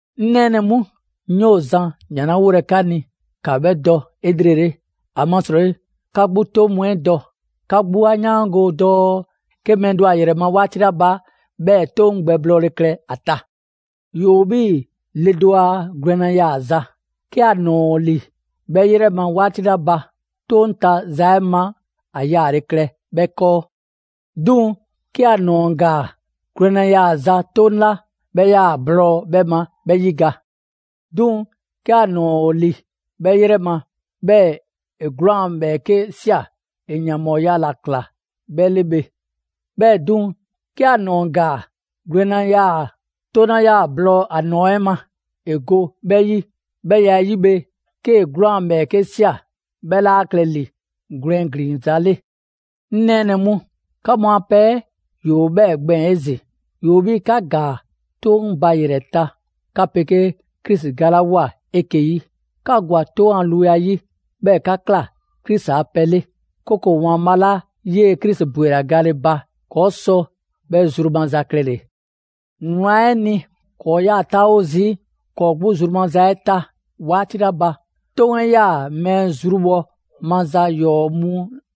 'Ŋ nɛɛnɛ‑ mu, 'ŋ 'yoo‑ zan ‑jan 'la 'wolɛ‑ 'ka ni, 'ka 'bhɛ dɔ 'elrele, ‑amasrɔyi 'ka 'gbu 'toŋ mu 'ɛ dɔ. 'Ka 'gbu 'a 'yaango‑ dɔɔ 'ke mɛɛ do ‑o ‑a ‑yrɛ ma 'waati 'la ba, 'bhɛɛ‑ 'toŋ 'ɛ gbɛblɔɔle klɛ ‑a ta. ‑Yoo 'bhii‑ le do a gwlɛnna yaaza: 'Ke ‑a ‑nɔɔ ‑o ‑li 'bhɛ 'yrɛ ma 'waati 'la ba, 'toŋ ta za 'ɛ ma, ‑a yaale klɛ 'bhɛ 'kɔɔ. 'Duŋ‑ 'ke ‑a ‑nɔɔ ‑gaa, gwlɛnna yaaza 'toŋ 'la 'bhɛ 'yaa‑ ‑a blɔɔ 'bhɛ ma, 'bhɛ 'yiga‑. 'Duŋ‑ 'ke ‑a ‑nɔɔ ‑o ‑li 'bhɛ 'yrɛ ma, 'bhɛɛ‑ ‑e 'gwlaan‑ ‑bhɛɛke' ꞊sia, ‑e ‑yanbhɔɔya ‑la ꞊kla 'bhɛ 'le bhe. 'Bhɛɛ‑ 'duŋ‑, 'ke ‑a ‑nɔɔ ‑gaa, gwlɛnna yaa‑ 'toŋ 'la 'yaa‑ ‑a blɔɔ ‑a ‑nɔɔ 'ɛ ma ‑e go 'bhɛ 'yi. 'Bhɛ ya 'yi bhe, 'kee‑ 'gwlaan‑ ‑bhɛɛke' ꞊sia, 'bhɛ 'laa klɛ ‑li gwlɛn ‑glinza' 'le. 'Ŋ nɛɛnɛ‑ mu, 'ka mu a pɛ 'ɛ ‑yoo 'bhɛɛ‑ gbɛɛn‑ 'ezin‑. ‑Yoo 'bhii‑ 'ka ‑gaa 'toŋ 'ɛ ba ‑yrɛ ta 'ka 'pegee Krisi galawoa 'eke‑ 'yi. 'Ka ‑gwa 'toŋ ‑a luya 'yi; 'bhɛɛ‑ 'ka ‑kla Krisi a pɛ 'le. 'Kooko‑ ‑Waanbhaa' 'la 'yee‑ Krisi ‑bwela gale ba ‑kɔɔ' sɔ 'bhɛ zru maza klɛle‑. Wlan 'ɛ ni, ‑kɔɔ' 'yaa‑ 'taawo zii' ‑kɔɔ' 'gbu zru maza 'ɛ ta 'waati 'la ba, 'toŋ 'ɛ 'yaa‑ mɛɛ zrubhɔ maza ‑yɔɔ' mu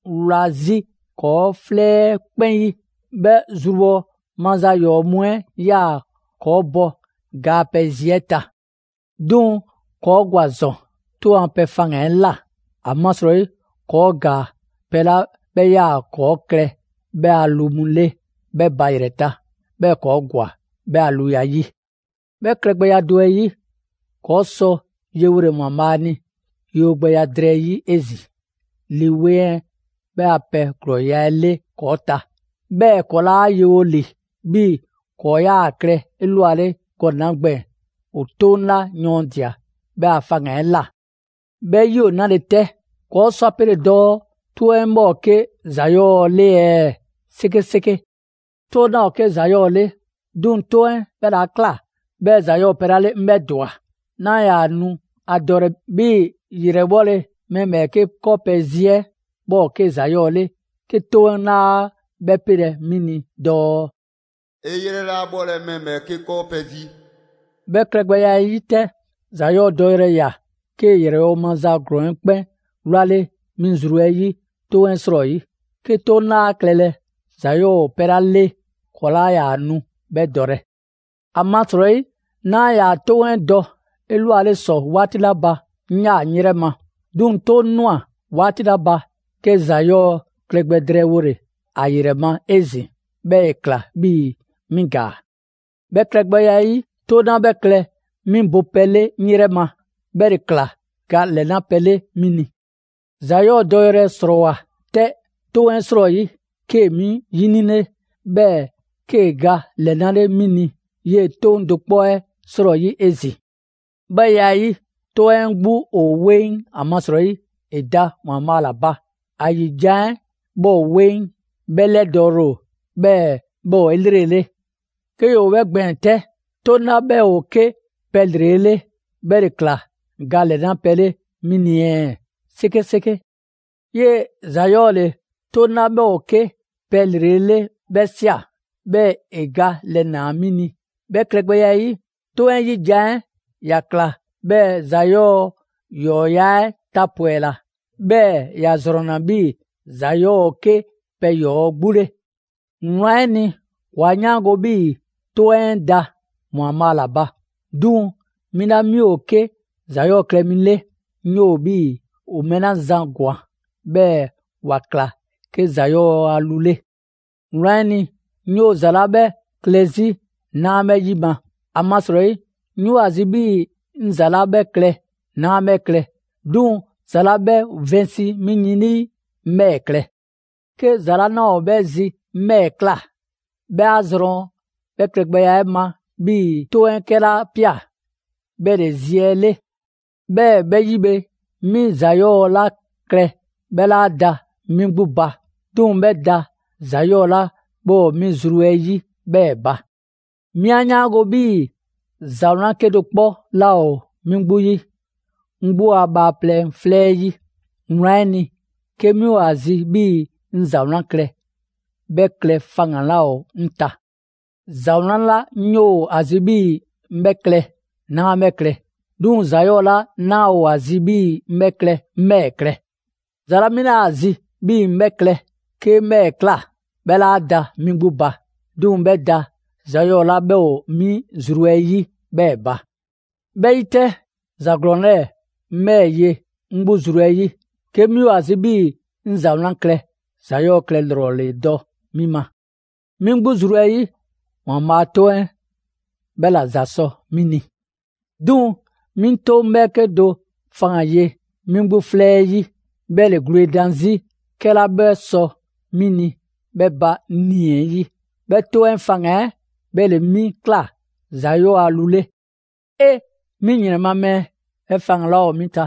wla 'zi ‑kɔɔ' 'flɛ 'ɛ 'kpɛn 'yi. 'Bhɛ zrubhɔ maza ‑yɔɔ' mu 'ɛ 'yaa‑ ‑kɔɔ' bɔ ga a pɛ zi 'ɛ ta. 'Duŋ‑ ‑kɔɔ' ‑gwa ‑zɔn 'toŋ a pɛ faŋgan‑ 'ɛ ꞊la, ‑amasrɔyi ‑kɔɔ' ‑gaa pɛ 'la 'bhɛ ‑yaa' ‑kɔɔ' klɛ 'bhɛ a lu mu 'le 'bhɛ ba ‑yrɛ ta, 'bhɛɛ‑ ‑kɔɔ' ‑gwa 'bhɛ a luya 'yi. 'Bhɛ klɛgbɛya do 'ɛ 'yi, ‑kɔɔ' sɔ yewole ‑Waanbhaa' ni yewogbɛya drɛɛ 'yi 'ezin‑ Lii 'Weŋ 'ɛ 'bhɛ a pɛ ‑glɔɔya' 'ɛ 'le ‑kɔɔ' ta. 'Bhɛɛ‑ ‑kɔɔ' 'laa yewo ‑li 'bhii‑ ‑kɔɔ' 'yaa‑ klɛ 'elwale gɔnɛ‑ 'la gbɛɛn‑ ‑o 'toŋ 'la yɔɔndia‑ 'bhɛ a faŋgan‑ 'ɛ ꞊la. 'Bhɛɛ‑ 'yi ‑o 'nale‑ 'tɛ? ‑Kɔɔ' sɔ ‑a pele dɔɔ 'toŋ 'ɛ 'bhɛ ‑o 'ke ‑za 'yɔɔ‑ 'le ɛɛ? 'Sekeseke! 'Toŋ 'laa ‑o 'ke ‑za 'yɔɔ‑ 'le, 'duŋ‑ 'toŋ 'ɛ 'bhɛ ‑le 'a ꞊kla 'bhɛɛ‑ ‑za 'yɔɔ‑ ‑o pɛ 'la 'le 'ŋ 'bhɛ ‑dwa. 'Naa ‑yaa nu ‑a dɔlɛ 'bhii‑ ‑yrɛbhɔle mɛɛ ‑bhɛɛke' 'kɔɔ pɛ zi 'ɛ, 'bhɛ ‑o 'ke ‑za 'yɔɔ‑ 'le 'ke 'toŋ 'laa 'bhɛ 'pelɛ‑ 'mi ni dɔɔ: «'E 'yrɛ 'laa 'bhɔlɛ‑ mɛɛ ‑bhɛɛke' 'kɔɔ pɛ zi.» 'Bhɛ klɛgbɛya 'ɛ 'yi 'tɛ, ‑za 'yɔɔ‑ dɔyrɛ ꞊ya, 'kee‑ ‑yrɛbhɔ' maza ‑glɔɔn 'ɛ 'kpɛn 'wlale 'mi zru 'ɛ 'yi 'toŋ 'ɛ 'srɔyi. 'Ke 'toŋ 'laa klɛlɛ, ‑za 'yɔɔ‑ ‑o pɛ 'la 'le ‑kɔɔ' 'laa ‑yaa nu 'bhɛ dɔlɛ. ‑Amasrɔyi 'naa ‑yaa 'toŋ 'ɛ dɔ 'elwale ‑sɔ 'waati 'la ba, 'ŋ 'yaa‑ 'ŋ 'yrɛ ma. 'Duŋ‑ 'toŋ ꞊nwa 'waati 'la ba, 'ke ‑za 'yɔɔ‑ klɛ gbɛ drɛɛwole ‑a ‑yrɛ ma 'ezin‑, 'bhɛɛ‑ ‑e ꞊kla 'bhii‑ 'mi ‑gaa. 'Bhɛ klɛgbɛya 'ɛ 'yi, 'toŋ 'la 'bhɛ klɛ 'mi bopɛ 'le 'ŋ 'yrɛ ma, 'bhɛ ‑le ꞊kla ga ‑lɛnapɛ 'le 'mi ni. ‑Za 'yɔɔ‑ dɔyrɛ ‑srɔɔwoa 'tɛ 'toŋ 'ɛ 'srɔyi, 'kee‑ 'mi 'yinile, 'bhɛɛ‑ 'kee‑ ga ‑lɛnale' 'mi ni 'yee‑ 'toŋ do 'kpɔ 'ɛ 'srɔyi 'ezin‑. 'Bhɛ ya 'ɛ 'yi, 'toŋ 'ɛ 'gbu ‑o 'weŋ ‑amasrɔyi ‑e da ‑Waanbhaa' ‑la ba; ‑a ‑yi jan 'ɛ 'bhɛ ‑o 'weŋ, 'bhɛ ‑lɛdɔɔle ‑o, 'bhɛɛ‑ 'bhɛ ‑o 'elrele. 'Ke ‑yoo 'bhɛ gbɛɛn‑ 'tɛ, 'toŋ 'la 'bhɛ ‑o 'ke pɛ ‑lrele' 'le, 'bhɛ ‑le ‑kla ga ‑lɛna' pɛ 'le 'mi ni ɛɛ? 'Sekeseke! 'Yee‑ ‑za 'yɔɔ‑ ‑le 'toŋ 'la 'bhɛ ‑o 'ke pɛ ‑lrele' 'le 'bhɛ ꞊sia, 'bhɛɛ‑ ‑e ga 'lɛnaa‑ 'mi ni. 'Bhɛ klɛgbɛya 'ɛ 'yi, 'toŋ 'ɛ 'yi jan 'ɛ ‑ya ꞊kla 'bhɛɛ‑ ‑za 'yɔɔ‑ ‑yɔɔya' 'ɛ tapwɛla, 'bhɛɛ‑ ‑ya ‑zrɔnna 'bhii‑ ‑za 'yɔɔ‑ ‑o 'ke pɛ ‑yɔɔ' 'gbu 'le. Wlan 'ɛ ni, ‑kɔɔ' 'a 'yaango‑ 'bhii‑ 'Toŋ 'ɛ da ‑Waanbhaa' ‑la ba; 'duŋ‑ 'mi 'la 'mi ‑o 'ke ‑za 'yɔɔ‑ klɛ mi 'le, 'ŋ 'yoo‑ 'bhii‑ ‑o mɛɛ 'la zan ‑gwan, 'bhɛɛ‑ ‑wa ꞊kla 'ke ‑za 'yɔɔ‑ a lu 'le. Wlan 'ɛ ni, 'ŋ 'yoo‑ za 'la 'bhɛ klɛ 'zi 'naa 'bhɛ 'yima‑: ‑amasrɔyi 'ŋ 'yoo‑ ‑a zi 'bhii‑ 'ŋ ‑za 'la 'bhɛ klɛ, 'naa 'bhɛ klɛ; 'duŋ‑ ‑za 'la 'bhɛ vɛnsi 'mi yin 'lii, 'ŋ 'bhɛɛ‑ klɛ. 'Ke ‑za 'la 'naa ‑o 'bhɛ zi 'ŋ 'bhɛɛ‑ ꞊kla; 'bhɛ 'a zrɔn 'bhɛ klɛgbɛya 'ɛ ma, 'bhii‑ 'Toŋ 'ɛ 'kɛla ꞊pia, 'bhɛ ‑le zi 'ɛ 'le. 'Bhɛɛ‑ 'bhɛ 'yi bhe, 'mi ‑za 'yɔɔ‑ 'la klɛ, 'bhɛ 'laa da 'mi 'gbu ba. 'Duŋ‑ 'bhɛ da ‑za 'yɔɔ‑ 'la 'bhɛ ‑o 'mi zru 'ɛ 'yi 'bhɛɛ‑ ba. 'Mi 'a 'yaango‑ 'bhii‑ ‑za 'wlan 'kedo‑ 'kpɔ 'laa ‑o 'mi 'gbu 'yi, 'ŋ 'gbu a bhaaplɛŋ 'flɛ 'ɛ 'yi. Wlan 'ɛ ni, 'ke 'mi ‑o ‑a zi 'bhii‑ 'ŋ ‑za 'wlan klɛ, 'bhɛ klɛ faŋgan‑ 'laa ‑o 'ŋ ta. ‑Za 'wlan 'la 'ŋ 'yoo‑ ‑a zi 'bhii‑ 'ŋ 'bhɛ klɛ, 'naa 'bhɛ klɛ; 'duŋ‑ ‑za 'yɔɔ‑ 'la 'naa ‑o ‑a zi 'bhii‑ 'ŋ 'bhɛ klɛ, 'ŋ 'bhɛɛ‑ klɛ. ‑Za 'la 'mi 'naa ‑a zi 'bhii‑ 'ŋ 'bhɛ klɛ, 'ke 'ŋ 'bhɛɛ‑ ꞊kla; 'bhɛ 'laa da 'mi 'gbu ba. 'Duŋ‑ 'bhɛ da ‑za 'yɔɔ‑ 'la 'bhɛ ‑o 'mi zru 'ɛ 'yi 'bhɛɛ‑ ba. 'Bhɛ 'yi 'tɛ, ‑za ‑glɔɔn 'lɛɛ‑ 'ŋ 'bhɛɛ‑ ye 'ŋ 'gbu zru 'ɛ 'yi: 'Ke 'mi ‑o ‑a zi 'bhii‑ 'ŋ ‑za 'wlan klɛ ‑za 'yɔɔ‑ klɛ ‑lrɔ ‑le dɔ 'mi ma. 'Mi 'gbu zru 'ɛ 'yi, ‑Waanbhaa' 'a 'Toŋ 'ɛ 'bhɛ ‑la ‑za sɔ 'mi ni. 'Duŋ‑ 'mi 'toŋ 'bhɛɛke do faŋgan‑ ye 'mi 'gbu 'flɛ 'ɛ 'yi, 'bhɛ ‑le gwledan 'zi 'kɛla 'bhɛ sɔ 'mi ni 'bhɛ ba 'ŋ 'nii‑ 'ɛ 'yi. 'Bhɛ 'toŋ 'ɛ faŋgan‑ 'ɛ 'bhɛ ‑le 'mi ꞊kla ‑za 'yɔɔ‑ a lu 'le. 'Ee! 'Mi ‑yrɛn ma mɛɛ! 'Bhɛ faŋgan‑ 'la ‑yoo 'mi ta,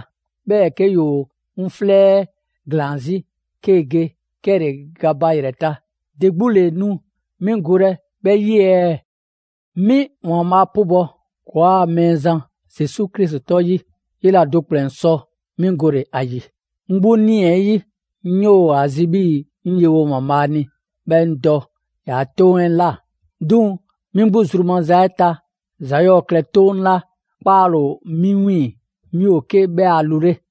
'bhɛɛ‑ 'ke ‑yoo 'ŋ 'flɛ 'ɛ ‑glaan 'zi 'kee‑ ge 'kɛle‑ ga ba ‑yrɛ ta, ‑de 'gbu ‑le nu 'mi golɛ 'bhɛ 'yi ɛɛ? 'Mi ‑Waanbhaa' 'pubɔ‑ ‑kɔɔa' Mɛɛzan Zesu Krisi 'tɔ 'yi, 'yela do ‑kplɛn sɔ 'mi gole‑ ‑a ‑yi! 'Ŋ 'gbu 'nii‑ 'ɛ 'yi, 'ŋ 'yoo‑ ‑a zi 'bhii‑ 'ŋ yewo ‑Waanbhaa' ni 'bhɛɛ‑ 'ŋ dɔ ‑yaa' 'Toŋ 'ɛ ꞊la. 'Duŋ‑ 'mi 'gbu zru maza 'ɛ ta, ‑za 'yɔɔ‑ klɛ 'toŋ 'la 'kpaale‑ ‑o 'mi 'wiiŋ‑, 'mi ‑o 'ke 'bhɛ a lu 'le.